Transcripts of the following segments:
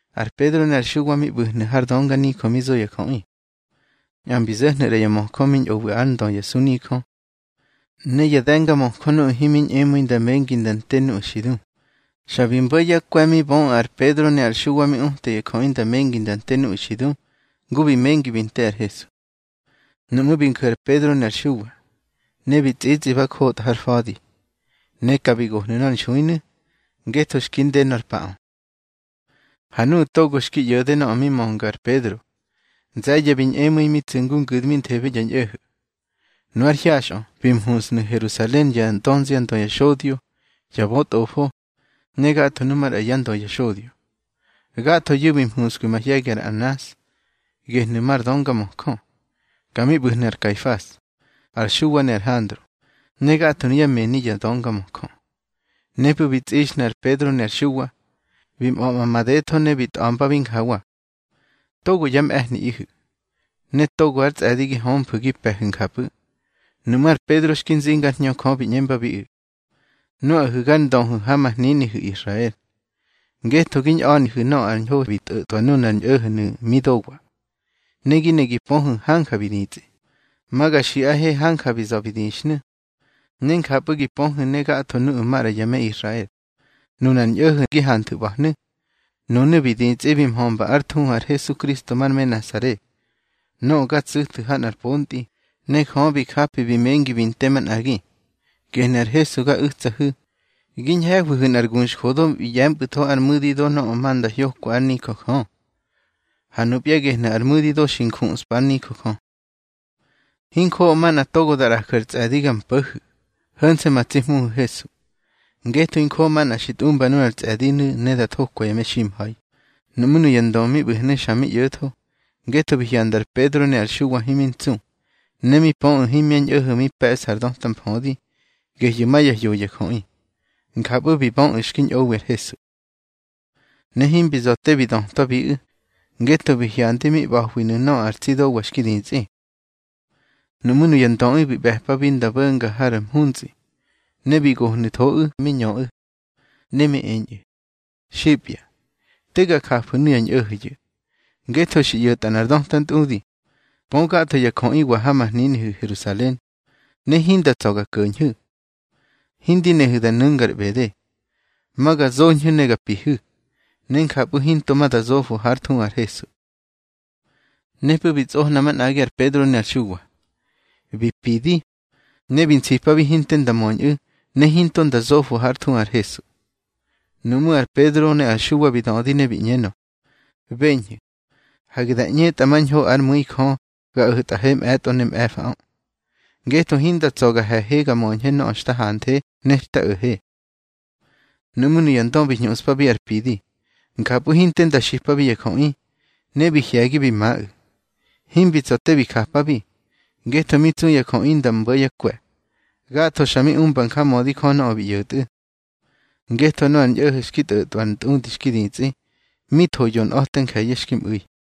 Ar Pedro ne ar Xuwa mi ꞌbu̱hnu̱ har dönganijö mi zo ya jöꞌi. Nꞌa mbi zo̱hnu̱ ꞌra ya möjö mi ñꞌowi ár ndö ya sunijö, ne ya de̱ngamöjö nuꞌu̱ himi ñꞌemu̱i nda mengi nda nte nuꞌu̱ xi du. Xa bi mbo̱ yá kwe̱ mi böꞌu̱ ar Pedro ne ar Xuwa mi uta ya jöꞌi nda mengi da nte nuꞌu̱ xi du, ngu bi mengi bi nte ar Hesu. Nuꞌmú̱ bi nju̱ ar Pedro ne ar Xuwa, ne bi tsꞌitsꞌi ba njotꞌa har fa̱di. Ne ka bi gohnu̱ nor nxuinu̱, ngetho xki nde nor paꞌö. Ha nuꞌu̱ togo xki ꞌyo̱de nöꞌö mi mönga ar Pedro, nze̱ye̱ bi ñꞌemu̱i, mi tsu̱ ngu ngu̱dminthebe ya ñꞌo̱ho̱. Nu ár hyaxꞌö bi mhuntsnu̱ Herusalen yá dönziandö ya xodyo, ya bötꞌofo, ne gatho nu maꞌra yá ndö ya xodyo. Gathoyu̱ bi mhuskwi mahye̱gi ar Anas, gehnu̱ mar döngamöjö. Ka mi ꞌbu̱hnu̱ ar Kaifas, ar Xuwa ne ar Handro, ne gatho nuyá mëni ya döngamöjö. Nepꞌu̱ bi tsꞌixnu̱ ar Pedro ne ar Xuwa, bi mꞌa̱ꞌma madetho ne bi tꞌa̱mbabi njawa: —Togo yá mꞌe̱hniꞌihu̱, ne togo ár tsꞌe̱di gi hömfu̱ gi pe̱hu̱ njapꞌu̱. Nuꞌmú̱ ar Pedro xki nzinga ár Hñö Jö bi ꞌñembabiꞌu̱: —Nuꞌahu̱ gár ndöhu̱ ha ma hninihu̱ Israel. Ngetho gi ñꞌa̱nihu̱ nöꞌö ar ñho bi tꞌo̱tꞌwa nunar tsi ñꞌo̱ho̱nu̱ mi dowa, ne gi ne gi pöhu̱ hanja bi ditsꞌi, ma ga xiꞌahe hanja bi za̱ bi dixhnu̱, ne njapꞌu̱ gi pöhu̱ ne gatho nuꞌu̱ maꞌra ya me Israel. Nunar ñꞌo̱ho̱ gi hanthu̱ ꞌba̱hnu̱, nunu̱ bi ditsꞌi bi mhömba ár thuhu ar Hesukristo mar me Nasare, nöꞌö ga tsu̱thu̱ ha nꞌar pontꞌi, ne Jö bi japi bi mengi bi nte manꞌagi. Gehnu̱ ar Hesu ga u̱tsahu̱, gi ñhe̱hwihu̱ nꞌar guxjödo bi ꞌye̱mpꞌu̱tho ar mu̱di do nöꞌö ma nda hyoka ár nijö Jö. Ha nupya gehnu̱ ar mu̱di do xi njuꞌspa ár nijö Jö. Hinjoꞌo manꞌa togo da ꞌraju̱ ar tsꞌe̱di ga mpo̱hu̱, ho̱nse̱ ma tsi Hmuhu̱ Hesu. Ngetho hinjoꞌo manꞌa xi tꞌumba nunar tsꞌe̱dinu̱ ne da thokwa ya meximha̱i. Nuꞌmú̱ nuya ndö mi ꞌbu̱hnu̱ xa mi ꞌyo̱tho, ngetho bi hyanda ar Pedro ne ar Xuwa himi ntsu. Ne mi pöꞌu̱ himya ñꞌo̱ho̱ mi pe̱ꞌsa ar döta mfödi, gehyu̱ ma ya hyoya jöꞌi. Njapꞌu̱ bi böꞌu̱ xki ñꞌowi ar Hesu. Ne himbi za̱ te bi dötwabiꞌu̱, ngetho bi hyandi mi ꞌba̱hwiꞌu̱ nöꞌö ar tsi dowa xki ditsꞌi. Nuꞌmú̱ nuya ndöꞌu̱ bi ꞌbe̱pabi nda bo̱nga har mhuntsꞌi, ne bi gohnu̱thoꞌu̱ mi ñöꞌu̱. Ne mi eñꞌu̱: —Xipya, te ga jafu̱ nuya ñꞌo̱ho̱yu̱. Ngetho xi ꞌyo̱tꞌa nꞌar döta ntꞌudi, pö gatho ya jöꞌiwa ha ma hninihu̱ Herusalen, ne hinda tsa̱ ga ko̱ñhu̱. Hindi nehu̱ da nu̱ngar ꞌbede. Ma ga zoñhu̱ ne ga pihu̱, ne njapꞌu̱ hinto ma da zofo hár thuhu ar Hesu. Nepꞌu̱ bi tsꞌohna manꞌagi ar Pedro ne ar Xuwa, bi pidi, ne bi nsipabi hinte nda möñꞌu̱, ne hinto nda zofo hár thuhu ar Hesu. Nuꞌmú̱ ar Pedro ne ar Xuwa bi dödi ne bi ꞌñenö: —Beñhu̱, hage da ꞌñetꞌa mañho ár mu̱i Jö ga o̱tꞌahe mꞌe̱tꞌo ne mꞌe̱faꞌö. Ngetho hinda tsa̱ ga he̱he ga möñhe nöꞌö xta hanthe ne xta o̱he. Nuꞌmú̱ nuya ndö bi hñuꞌspar pidi, njapꞌu̱ hinte nda xipabi ya jöꞌi, ne bi hye̱gi bi maꞌu̱. Himbi tsa̱ te bi japabi, ngetho mi tsu ya jöꞌi nda mbo̱ yá kwe̱. Gatho xa mi umba njamödi Jö nöꞌö bi ꞌyo̱tꞌu̱. Ngetho nöꞌö ar ñꞌo̱ho̱ xki tꞌo̱tꞌwa ar ntꞌudi xki ditsꞌi, mi tho yonꞌa̱te nje̱ye̱ xki mꞌu̱i.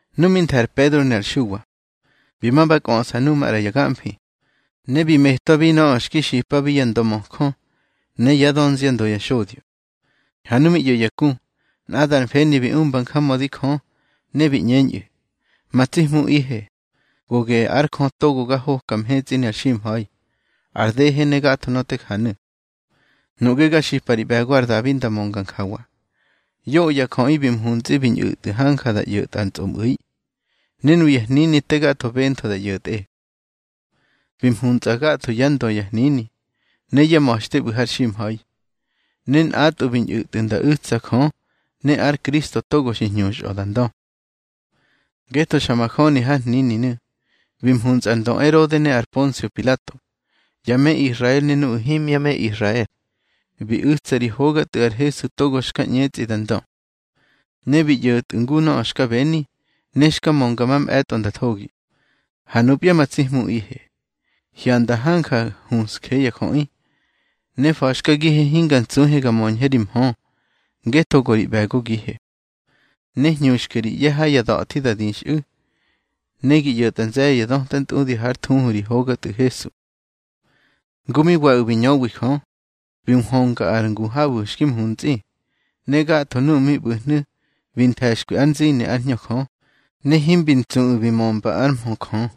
Nu mi nthe̱ ar Pedro ne ar Xuwa, bi ma ba kꞌöꞌsa nuꞌu̱ maꞌra ya gamfi, ne bi metwabi nöꞌö xki xipabi ya ndömöjö ne yá dönziandö ya xodyo. Ha nu mi ꞌyo̱ ya ku, nꞌadar mfeni bi umba njamödi Jö, ne bi ꞌñeñꞌu̱: —Ma tsi Hmuꞌihe, go geꞌe ar Jö togo ga hoka mhetsꞌi ne ar ximha̱i, ar dehe ne gatho nöꞌö te janu̱. Nuꞌge ga xipa ri ꞌbe̱go ar Dabi nda mönga njawa: Yoꞌö ya jöꞌi bi mhuntsꞌi bi ñꞌu̱tꞌu̱ hanja nda ꞌyo̱tꞌa ar tsꞌomꞌu̱i, ne nuya hnini te gatho bentho da ꞌyo̱tꞌe. Bi mhuntsꞌa gatho yá ndö ya hnini ne yá ma̱xte ꞌbu̱ har ximha̱i, ne nꞌatꞌwu̱ bi ñꞌu̱tꞌu̱ nda u̱tsa Jö ne ár Kristo togo xi hñuxꞌö da ndö. Ngetho xa majöni har hnininu̱, bi mhuntsꞌa ar ndö Erode ne ar Ponsio Pilato, ya me Israel ne nuꞌu̱ himya me Israel, bi u̱tsa ri hoga Tꞌu̱ ar Hesu togo xka ꞌñetsꞌi da ndö. Ne bi ꞌyo̱tꞌu̱ ngu nöꞌö xka beni, ne xka mönga mamꞌe̱tꞌo nda thogi. Ha nupya ma tsi Hmuꞌihe, hyanda hanja huꞌsje ya jöꞌi. Ne fa̱xkagihe hinga ntsuhe ga möñhe ri mhö, ngetho go ri ꞌbe̱gogihe. Ne hñuxke ri ꞌye̱ ha ya da̱thi da dixꞌu̱. Ne gi ꞌyo̱tꞌa nze̱ye̱ ya döta ntꞌudi hár thuhu ri hoga Tꞌu̱ Hesu. Ngu mi waꞌu̱ bi ñöwi Jö, bi nhwönga ar ngu habu̱ xki mhuntsꞌi. Ne gatho nuꞌu̱ mi ꞌbu̱hnu̱ bi nthe̱xkwi ár nzini ár Hñö Jö, ne himbi ntsuꞌu̱ bi mömba ár mhö Jö.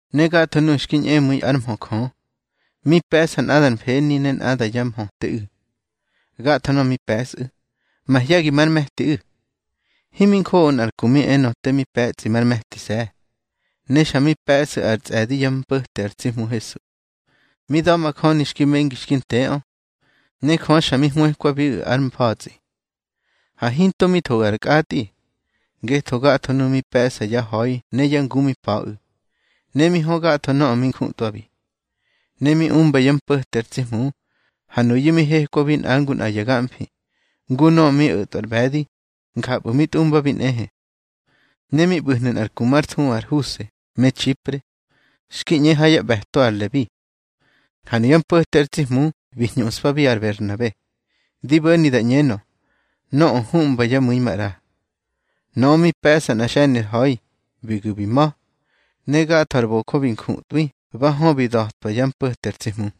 Ne gatho nuꞌu̱ xki ñꞌemu̱i ár mhö Jö, mi pe̱ꞌsa nꞌada ar mfeni, ne nꞌada yá mhöteꞌu̱. Gatho nöꞌö mi pe̱sꞌu̱, mahye̱gi mar me̱tiꞌu̱. Himi njoꞌo nꞌar ku mi enö te mi pe̱tsꞌi mar me̱tise̱. Ne xa mi pe̱sꞌu̱ ar tsꞌe̱di yá mpo̱te ar tsi Hmu Hesu, mi da̱majöni xki mengi xki nteꞌö, ne Jö xa mi hwëkwabiꞌu̱ ár mfa̱tsꞌi. Ha hinto mi thoꞌu̱ ar kꞌatꞌi, ngetho gatho nuꞌu̱ mi pe̱ꞌsa yá ha̱i ne yá ngu mi pa̱ꞌu̱, ne mi hö gatho nöꞌö mi njutꞌwabi, ne mi umba yá mpo̱te ar tsi Hmu. Ha nuyu̱ mi hekwabi nꞌa ngu nꞌa ya gamfi, ngu nöꞌö mi o̱tꞌwa ar ꞌbe̱di, njapꞌu̱ mi tꞌumbabi nꞌehe. Ne mi ꞌbu̱hnu̱ nꞌar ku már thuhu ar Huse me Txipre, xki ꞌñe ha yá ꞌbe̱to ar Lebi. Ha nuyá mpo̱te ar tsi Hmu bi hñuꞌspabi ar Berhnabe, di bo̱ni da ꞌñenö, nöꞌö huꞌmba yá mu̱i maꞌra. Nöꞌö mi pe̱ꞌsa nꞌa xe̱ni ar ha̱i, bi gu̱ bi ma̱, ne gatho ar bojö bi njutꞌwi ba hö bi da̱twa yá mpo̱te ar tsi Hmu.